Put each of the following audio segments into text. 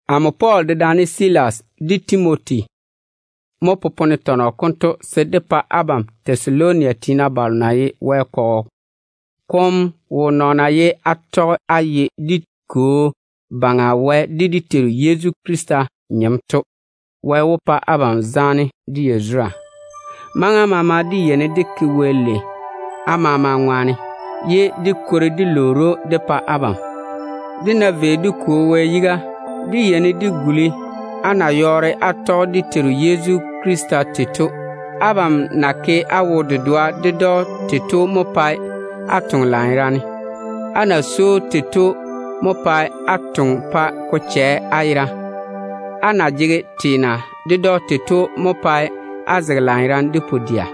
Amo Pɔɔl dedaane Silas de Timoti mo popone tɔnɔ konto se dé pa abam Tɛsaloni tiina balo na ye Wɛ kɔgɔ kom wo nɔɔna ye á tɔge á ye dé Kwo Baŋa Wɛ de dé Teiru Yezu Krista nyem to. Wɛ wó pa abam zaane de yazura. Maŋa maama dé yeini dé ke Wɛ lei á maama ŋwaane, ye dé kwori dé lwoori‑o dé pa abam. Dé ná vei dé Kwo Wɛ yiga, dé yeini dé guli á na yɔɔre á tɔge dé Teiru Yezu Krista tei to. Abam na ke á wo-dedoa ded‑o tei to mo pae á toŋe lanyerane. Á na swoi‑o tei to mo pae á toŋe pa ko chɛ á yera. Á na jege teena ded‑o tei to mo pae á zege lanyerane de pu-dɛa.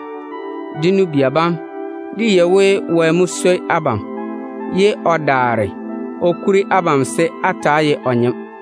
Dé nu-bia bam, dé yei we Wɛ mo swoi abam, ye o daare o kuri abam se á ta‑á ye o nyem.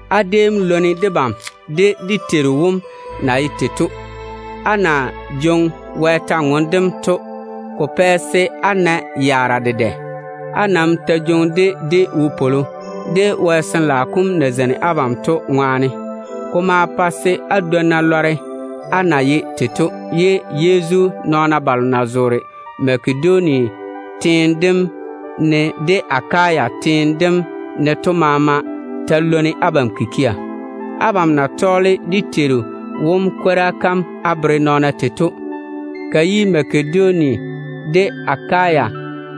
Á déem lwoni debam de dé Teiru wom na ye tei to. Á na jwoŋi Wɛ kwor-ywoŋa kam to, ko pɛ se á na yaara dedɛ. Á nam ta jwoŋi-ka de wopwolo, Wɛ Sin-laao kom na zeini abam to ŋwaane. Ko ma pa se á dwonna lɔre á na ye tei to, ye Yezu nɔɔna balo na zoore Makedonia de Akaya teene dem ne to maama ta lwoni abam kikia. Abam na tɔɔle dé Teiru wom kwora kam á bere nɔɔna tei to, ka yi Makedonia Tɛsaloni déem ye Makedonia kateiri dem teo kamunu kom. de Akaya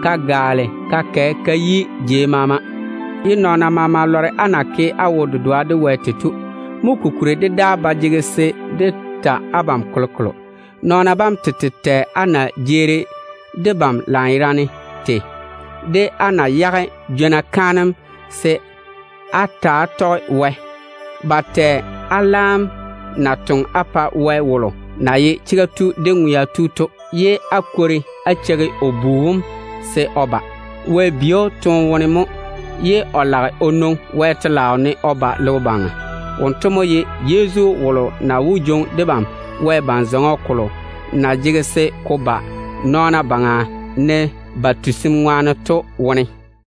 ka gaale ka kɛ ka yi jei maama, ye nɔɔna maama lɔre á na ke á wo-dedoa de Wɛ tei. Mo kokuri dé daa ba jege se dé ta abam kolokolo. Nɔɔna bam tete yeini ba tɛ á na jeeri debam lanyerane tei to. Ba lɔre á na yage jwona kaanem mo se á daare á ta‑á tɔge Wɛ. Ba maa tɛ á laam na toŋe á pa Wɛ wom na ye chega tu de ŋwea tu to, ye á kwori á cheigi o Bu wom se o jwoori o ba. Wɛ bi‑o toone wone mo, ye o lage o nwoŋi Wɛ telaao ne o ba logo baŋa. Wonto mo ye Yezu wolo na wó jwoŋi debam Wɛ ban-zɔŋɔ kom na wó ba nɔɔna baŋa to wone.